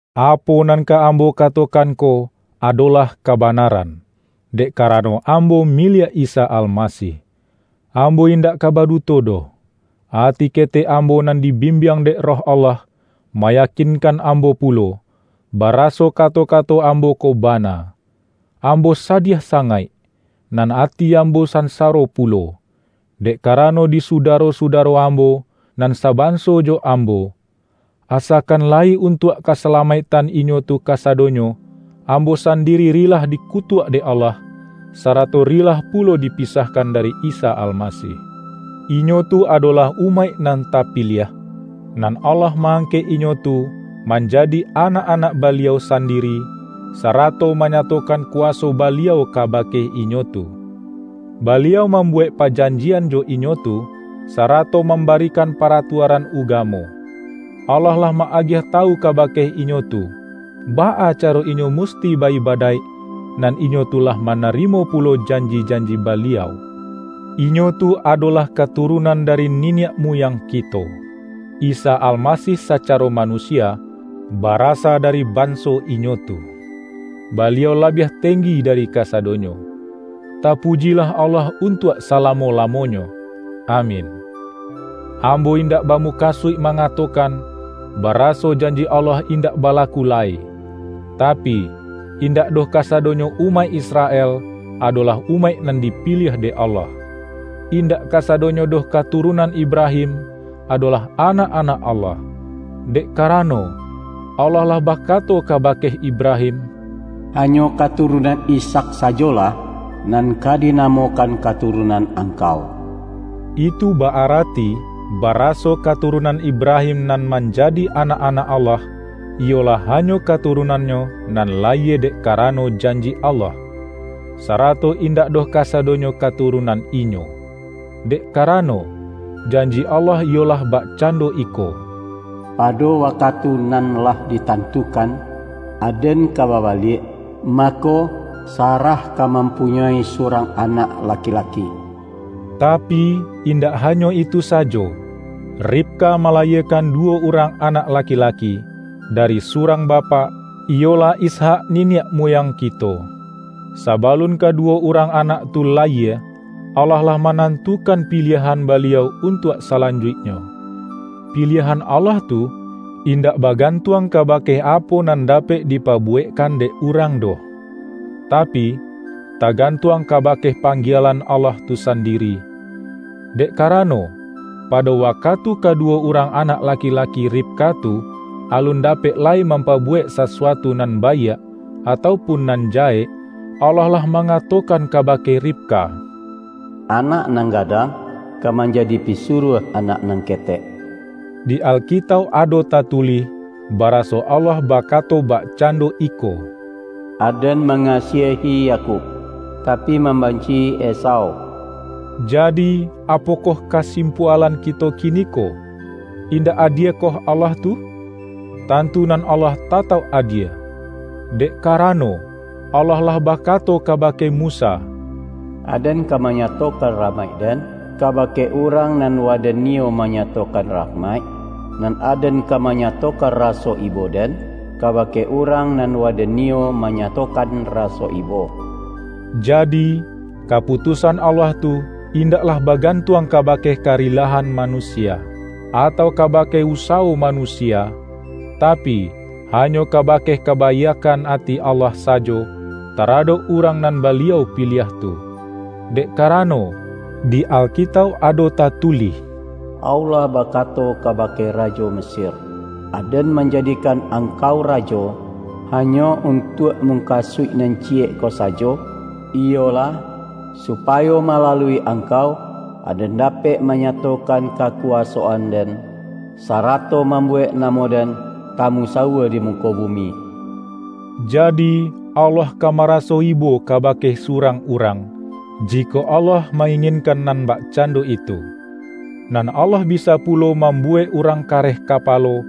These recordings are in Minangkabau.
Apo nan ka ambo katokan ko, adolah kabanaran, dek karano ambo miliak Isa Almasih. Ambo indak ka baduto doh. Ati ketek ambo nan dibimbiang dek Roh Allah, mayakinkan ambo pulo, baraso kato-kato ambo ko bana. Ambo sadiah sangaik, nan ati ambo sansaro pulo, dek karano di sudaro-sudaro ambo, nan sabanso jo ambo. Asakan layi untuak kasalamaiktan inyo tu kasadonyo, ambo sandiri rilah dikutuak dek Allah, sarato rilah pulo dipisahkan dari Isa Almasih. Inyo tu adolah umaik nan tapiliah, nan Allah ma-angkek inyo tu, manjadi anak-anak Baliau sandiri, sarato manyatokan kuwaso Baliau kabake inyo tu. Baliau mambuwek pajanjian jo inyo tu, sarato mambarikan paratuaran ugamo. Allah lah ma-agiah tawu kabake inyo tu, baa caro inyo musti ba-ibadaik, nan inyo tu lah manarimo pulo janji-janji Baliau. Inyo tu adolah katurunan dari niniak muyang kito. Isa Almasih sacaro manusia, barasa dari banso inyo tu. Baliau labiah tenggi dari kasadonyo. Tapujilah Allah untuak salamo-lamonyo! Amin. Ambo indak bamukasuik ma-ngatokan, baraso janji Allah indak balaku lai; tapi, indak doh kasadonyo umaik Israel, adolah umaik nan dipiliah dek Allah. Indak kasadonyo doh katurunan Ibrahim, adolah anak-anak Allah. Dek karano, Allah lah bakato kabake Ibrahim,”Hanyo katurunan Ishak sajolah, nan ka dinamokan katurunan angkau.” Itu ba-arati, baraso katurunan Ibrahim nan manjadi anak-anak Allah, iyolah hanyo katurunannyo nan layie dek karano janji Allah; sarato indak doh kasadonyo katurunan inyo. Dek karano, janji Allah iyolah bakcando iko,”Pado wakatu nan lah ditantukan, Aden ka babaliak, mako, Sarah ka mampunyoi surang anak laki-laki.” Tapi, indak hanyo itu sajo: Ribka malayiekan duwo urang anak lakilaki, dari surang bapak, iyolah Ishak niniak muyang kito. Sabalun kaduwo urang anak tu layie, Allah lah manantukan piliahan Baliau untuak salanjuiknyo. Piliahan Allah tu, indak bagantuang kabake apo nan dapek dipabuwekkan dek urang doh, tapi, tagantuang kabake panggielan Allah tu sandiri. Dek karano, pado wakatu kaduwo urang anak laki-laki Ribka tu, alun dapek lai mampabuwek sasuatu nan baiak, atau pun nan jahek, Allah lah mangatokan kabake Ribka,”Anak nan gadang, ka manjadi pisuruah anak nan ketek.” Di Alkitauk ado tatulih, baraso Allah bakato bakcando iko,”Aden mangasiahi Yakub, tapi mambanci-i Esau.” Jadi, apokoh kasimpualan kito kiniko? Indak adiekoh Allah tu? Tantu nan Allah tatauk adie! Dek karano, Allah lah bakato kabake Musa,”Aden ka manyatokan rahmaik-Den, kabake urang nan Waden niyo manyatokan rahmaik, nan Aden ka manyatokan raso ibo-Den, kabake urang nan Waden niyo manyatokan raso ibo.” Jadi, kaputusan Allah tu indaklah bagantuang kabake karilahan manusia, atau kabake usawo manusia, tapi, hanyo kabake kabaiakkan ati Allah sajo, taradok urang nan Baliau piliah tu. Dek karano, di Alkitauk ado tatulih,”Allah bakato kabake rajo Mesir, ’Aden manjadikan angkau rajo, hanyo untuak mukasuik nan ciyek ko sajo, iyolah, supayo malalui angkau, Aden dapek manyatokan kakuwasoan-Den, sarato mambuwek namo-Den tamusawua di muko bumi.’” Jadi, Allah ka maraso ibo kabake surang urang, jikok Allah ma-inginkan nan bakcando itu. Nan Allah bisa pulo mambuwek urang kareh kapalo,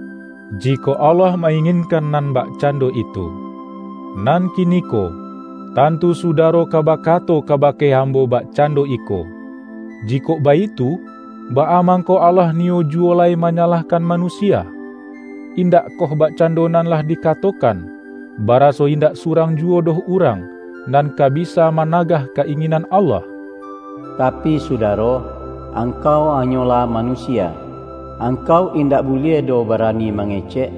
jikok Allah ma-inginkan nan bakcando itu. Nan kiniko, tantu sudaro ka bakato kabake ambo bakcando iko,”Jikok baitu, baa mangko Allah niyo juwo lai manyalahkan manusia? Indakkoh bakcando nan lah dikatokan, baraso indak surang juwo doh urang, nan ka bisa managah ka-inginan Allah?” Tapi sudaro! Angkau hanyolah manusia. Angkau indak buliah doh barani mangecek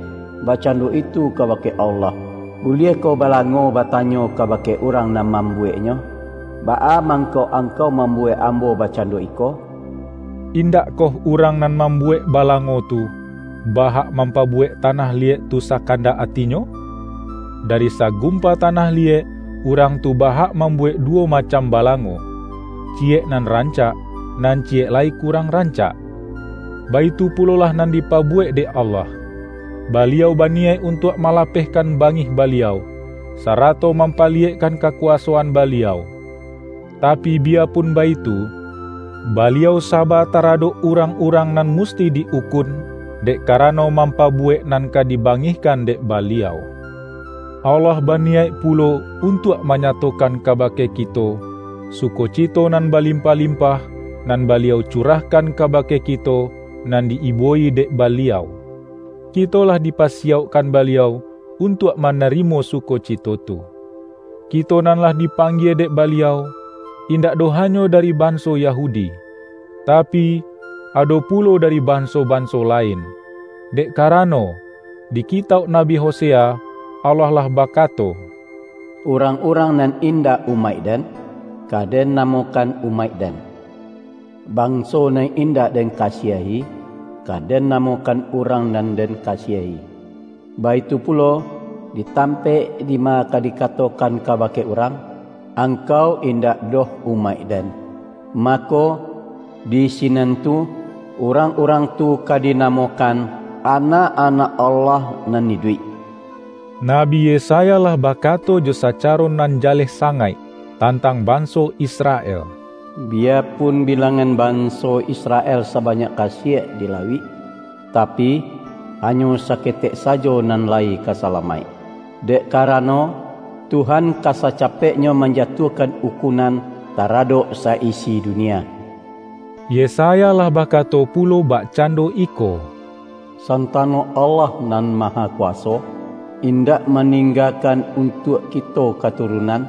bakcando itu kabake Allah! Buliahkoh balango batanyo kabake urang nan mambuweknyo,”Baa mangko angkau mambuwek ambo bakcando iko?” Indakkoh urang nan mambuwek balango tu, ba-hak mampabuwek tanah liyek tu sakandak atinyo? Dari sagumpa tanah liyek, urang tu ba-hak mambuwek duwo macam balango: ciyek nan rancak, nan ciyek lai kurang rancak. Baitu pulolah nan dipabuwek dek Allah. Baliau baniyaik untuak malapehkan bangih Baliau, sarato mampaliyekkan kakuwasoan Baliau. Tapi, biyapun baitu, Baliau saba taradok urang-urang nan musti di-ukun, dek karano mampabuwek nan ka dibangihkan dek Baliau. Allah baniyaik pulo untuak manyatokan kabake kito, sukocito nan balimpah-limpah, nan Baliau curahkan kabake kito nan di-ibo-i dek Baliau. Kito lah dipasiyaukkan Baliau untuak manarimo sukocito tu. Kito nan lah dipanggie dek Baliau, indak doh hanyo dari banso Yahudi, tapi, ado pulo dari banso-banso lain. Dek karano, di kitauk Nabi Hosea, Allah lah bakato,”Urang-urang nan indak umaik-Den, ka Den namokan ’Umaik-Den’. Banso nan indak Den kasiahi, ka Den namokan ’Urang nan Den kasiahi'. Baitu pulo, di tampaik dima ka dikatokan kabake urang, Angkau indak doh umaik-Den,’ mako, di sinan tu, urang-urang tu ka dinamokan, anak-anak Allah nan iduik.” Nabi Yesaya lah bakato jo sacaro nan jaleh sangaik, tantang banso Israel,”Biyapun bilangan banso Israel sabanyak kasiek di lauik, tapi, hanyo saketek sajo nan lai ka salamaik; dek karano, Tuhan ka sacapeknyo manjatuahkan ukunan taradok sa-isi dunia.” Yesaya lah bakato pulo bakcando iko,”Santano Allah Nan Mahakuwaso, indak maninggakan untuak kito katurunan,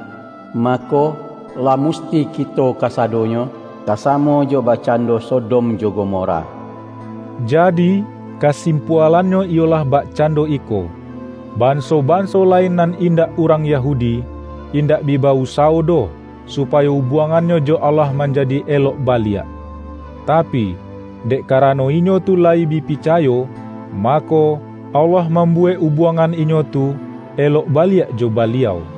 mako, lah musti kito kasadonyo, ka samo jo bakcando Sodom jo Gomora.” Jadi, kasimpualannyo iyolah bakcando iko: Banso-banso lain nan indak urang Yahudi, indak bi ba-usawo doh, supayo ubuangannyo jo Allah manjadi elok baliak. Tapi, dek karano inyo tu layi bi picayo, mako, Allah mambuwek ubuangan inyo tu, elok baliak jo Baliau.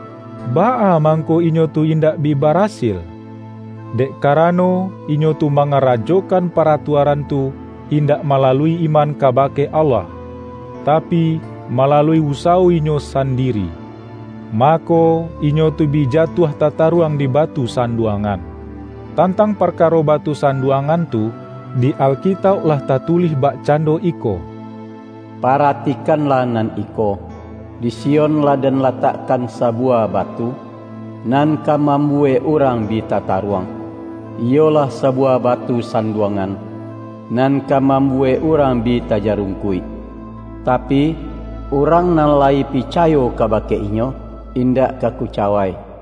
Baa mangko inyo tu indak bi barasil? Dek karano, inyo tu mangarajokan paratuaran tu, indak malalui iman kabake Allah, tapi, malalui usawo inyo sandiri. Mako, inyo tu bi jatuah tataruang di”Batu Sanduangan”. Tantang parkaro Batu Sanduangan tu, di Alkitauk lah tatulih bakcando iko,”Paratikanlah nan iko: Di Sion lah Den latakkan sabuwah batu, nan ka mambuwek urang bi tataruang; iyolah sabuwah batu sanduangan, nan ka mambuwek urang bi tajarungkuik. Tapi, urang nan layi picayo kabake Inyo, indak ka kucawai.” ROMA